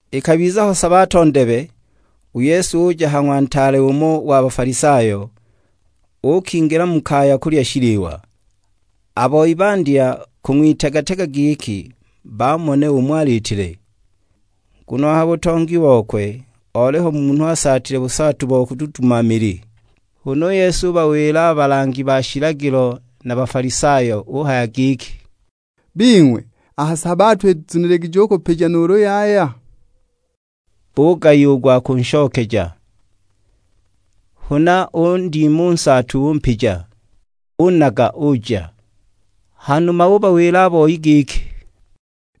Ikabiza ho sabato ndebe, u Yesu uja ha ng'wa ntaale umo wa Bafalisayo, uukingila mu kaya kulya shiliwa. A boi bandya kung'witega-tega giki bamone umo aliitile. Nguno a ha butongi bokwe oliho munhu asaatile busaatu bo kududuma mili. Huna u Yesu ubawila a balangi ba shilagilo na a Bafalisayo, uhaya giki; "Bing'we, a ha sabato izuniligije u kupija nuulu yaya?" Bugayiwa u gwa kunshokeja. Huna undima u nsaatu umpija, unaga uja. Hanuma ubawila a boi giki,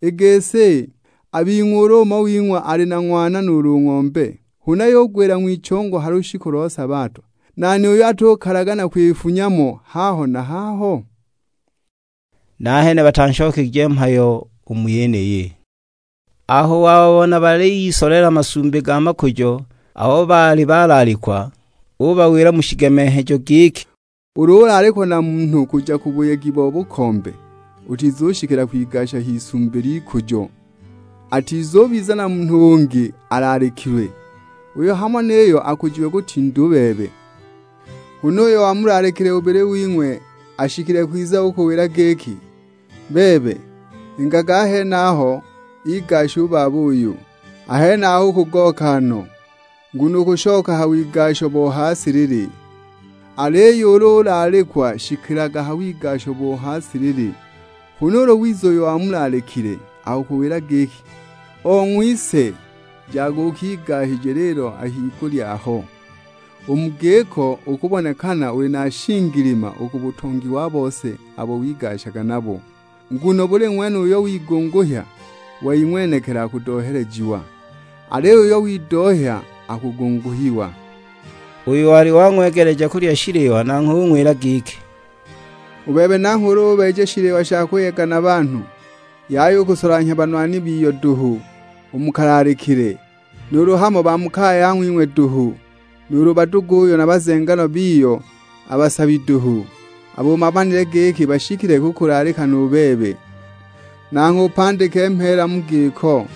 "I gisi, a bing'we ulu umo wing'we ali na ng'wana nuulu ng'ombe, huna yugwila ng'wichongo ha lushiku lo sabato, nani uyo atukalagana kwifunya mo haho na haho?" Nahene batanshokegije mhayo u mu yeniyi. Aho wababona baliyisolela masumbi ga makujo abo baali balaalikwa, ubawila mu shigemenghejo giki, "Ulu ulaalikwa na munhu kuja ku buyegi bo bukombe, utizushikila kwigasija isumbi ly'ikujo, atizubiza na munhu ungi alaalikilwe, uyo hamo niyo akujiwe kutinda u bebe. Huna uyo wamulaalikile bubili wing'we ashikile kwiza ukuwila giki, 'Bebe, ingaga a henaho igashe u baba uyu!' A henaho ukugooka no, nguno ukushoka ha wigasho bo ha silili. Aliyo ulu ulaalikwa shikilaga ha wigasho bo ha silili, huna ulu wiza uyo wamulaalikile, akukuwila giki; 'Ong'wise, jaga ukigasije lilo a higulya aho.' U mu giko ukubonekana uli na shingilima u ku butongi wa bose abo wigashaga nabo. Nguno buli ng'wene uyo wigunguhya wei ng'wenekili akudohelejiwa, aliyo uyo widohya akugunguhiwa." Uyo wali wang'wegeleja kulya shiliwa nanghwe ung'wila giki, "U bebe nangho ulu ubeeja shiliwa sha kuyega na banhu, yaya u kusolanhya banwani biyo duhu u mu kalaalikile, nuulu hamo ba mu kaya ya ng'wing'we duhu. Nuulu baduguyo na bazenganwa biyo a basabi duhu, abo umanile giki bashikile kukulaalika nu bebe; nangho upandike mheela mu giko.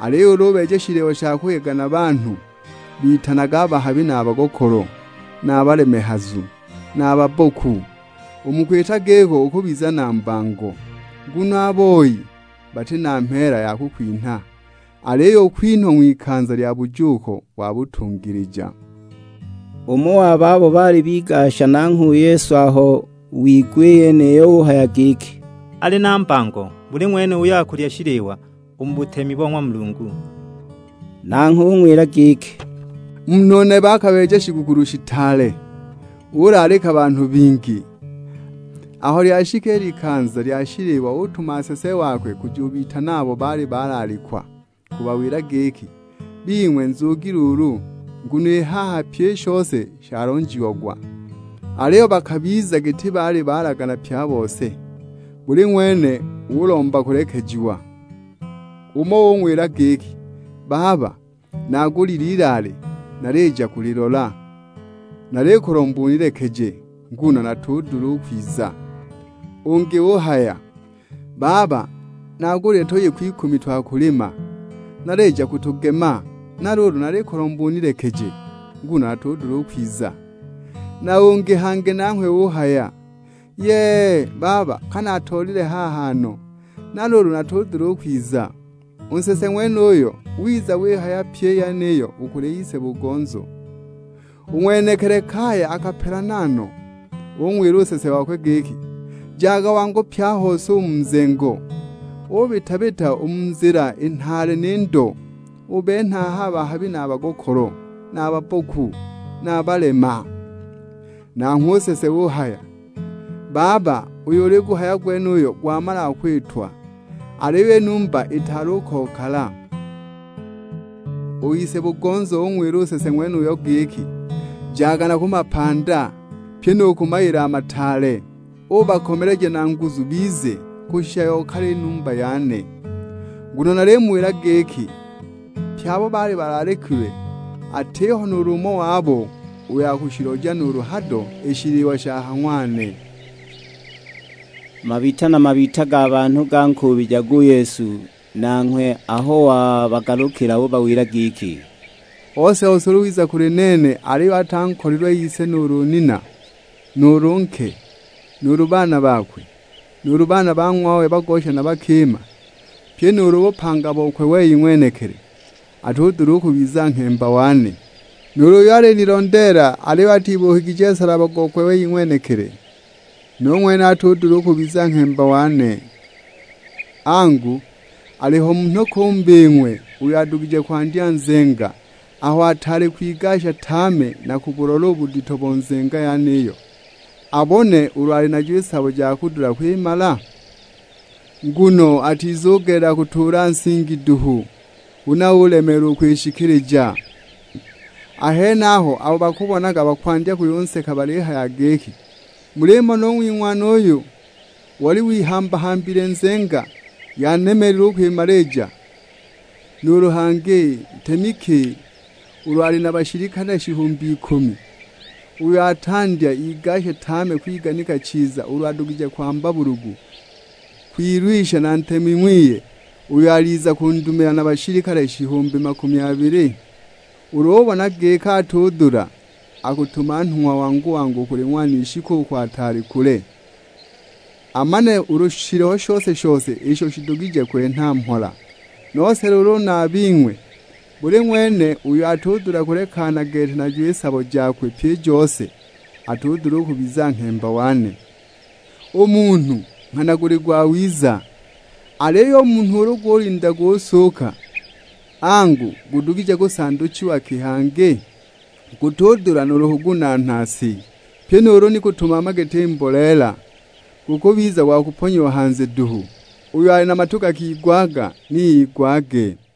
Aliyo ulu ubeeja shiliwa sha kuyega na banhu, bitanage a bahabi na a bagokolo, na a balemehazu, na a babboku. U mu kwita giko ukubiza na mbango; nguno a boi bati na mheela ya kukwinha, aliyo ukwinhwa ng'wikanza lya bujuuko wa batungilija." Umo wa babo baali bigasha nanghwe u Yesu aho wigwa i yeniyo uhaya giki, "Ali na mbango buli ng'wene uyo akulya shiliwa u mu butemi bo ng'wa Mulungu." Nanghwe ung'wila giki, "Munhu nebe akabeeja shigukulu shitaale, ulaalika banhu bingi. Aho lyashika i likanza lya shiliwa utuma nsese wakwe kujubitana abo baali balaalikwa. Kubawila giki, 'Bing'we nzugi luulu, nguno i haha pyi i shose shalonjiagwa.' Aliyo bakabiza giti baali balagana pye a bose, buli ng'wene ulomba kulekejiwa. Umo ung'wila giki, 'Baba, naagulile ilaale, nalija kulilola, nalikulomba unilekeje nguno natudula u kwiza.' Ungi uhaya, 'Baba, naagulile tuyiku ikumi twa kulima, nalija kutugema; na luulu nalikulomba unilekeje, nguno natudula u kwiza.' Na ungi hangi nanghwe uhaya, 'Yee, baba ka naatoolile haha no, na luulu natudula u kwiza!' U nsese ng'wenuyo wiza wihaya pyi i yeniyo u kuli ise-bugonzo. U ng'wenekili kaya akapelana no, ung'wila u nsese wakwe giki. 'Jaga wangu pye a hose u mu nzengo; ubita-bita u mu nzila i nhaale ni ndo; ubenhe aha a bahabi na a bagokolo, na a babboku, na a balema.' Nanghwe u nsese uhaya, 'Baba uyo uliguhaya gwenuyo gwamalaga kwitwa, aliyo i numba itaali u kokala!' U ise-bugonzo ung'wila u nsese ng'wenuyo giki, 'Jaga na ku mapanda, pyi nu ku mayila a mataale, uubakomeleja na nguzu bize, kushisha yokale i numba yane! Nguno nalimuwila giki, pye abo baali balaalikilwe atiho nuulu umo wabo uyo akushiloja nuulu hado i shiliwa sha ha ng'wane!' " Mabita na mabita ga banhu gankuubijaga u Yesu, nanghwe aho wabagalukila ubawila giki, "Ose-ose ulu wiza kuli nene aliyo atankolilwe ise nuulu nina, nuulu nke, nuulu baana bakwe, nuulu baana ba ng'wawe bagosha na bakima; pyi nuulu bupanga bokwe wei ng'wenekili, atudula u kubiza nghemba wane. Nuulu uyo alinilondeela aliyo atibuukigije nsalaba gokwe wei ng'wenekili, nu ng'wene atudula u kubiza nghemba wane. Angu, aliho munhu ki u mu bing'we uyo adugije kwandya nzenga aho ataali kwigasha tame na kubulola u budito bo nzenga yeniyo, abone ulu ali najo i sabo ja kudula kwimala? Nguno atizugelela kutuula nsingi duhu, huna ulemeelwa u kwishikilija. A henaho abo bakubonaga bakwandya kuyunseka balihaya giki, 'Mulimona u ng'wing'wana uyu; oli wihamba-hambile nzenga, yanemeelile u kwimalija!' Nuulu hangi, ntemi ki ulu ali na bashilikale shihumbi ikumi, uyo atandya igashe tame kwiganika chiza ulu adugije kwamba bulugu kwilwisha na ntemi ng'wiye, uyo aliza kundumila na bashilikale shihumbi makumi abili? Ulu ubona giki atudula, akutuma nhung'wa wangu u kuli ng'wanishi kuko ataali kule, amane ulu shiliho shose-shose isho shidugije kwenha mhola. Nose luulu na a bing'we, buli ng'wene uyo atudula kulekana gete najo i sabo jakwe pyi i jose, atudula u kubiza nghemba wane! U munhu nghana guli gwawiza, aliyo u munhu ulu gulinda gusuuka, angu, gudugije kusanduchiwa ki hangi? Gutudula nuulu kugunaana si, pyi nuulu ni kutumama giti mboleela; gukubiza gwa kuponyiwa hanze duhu! Uyo ali na matu gakigwaga ni igwage."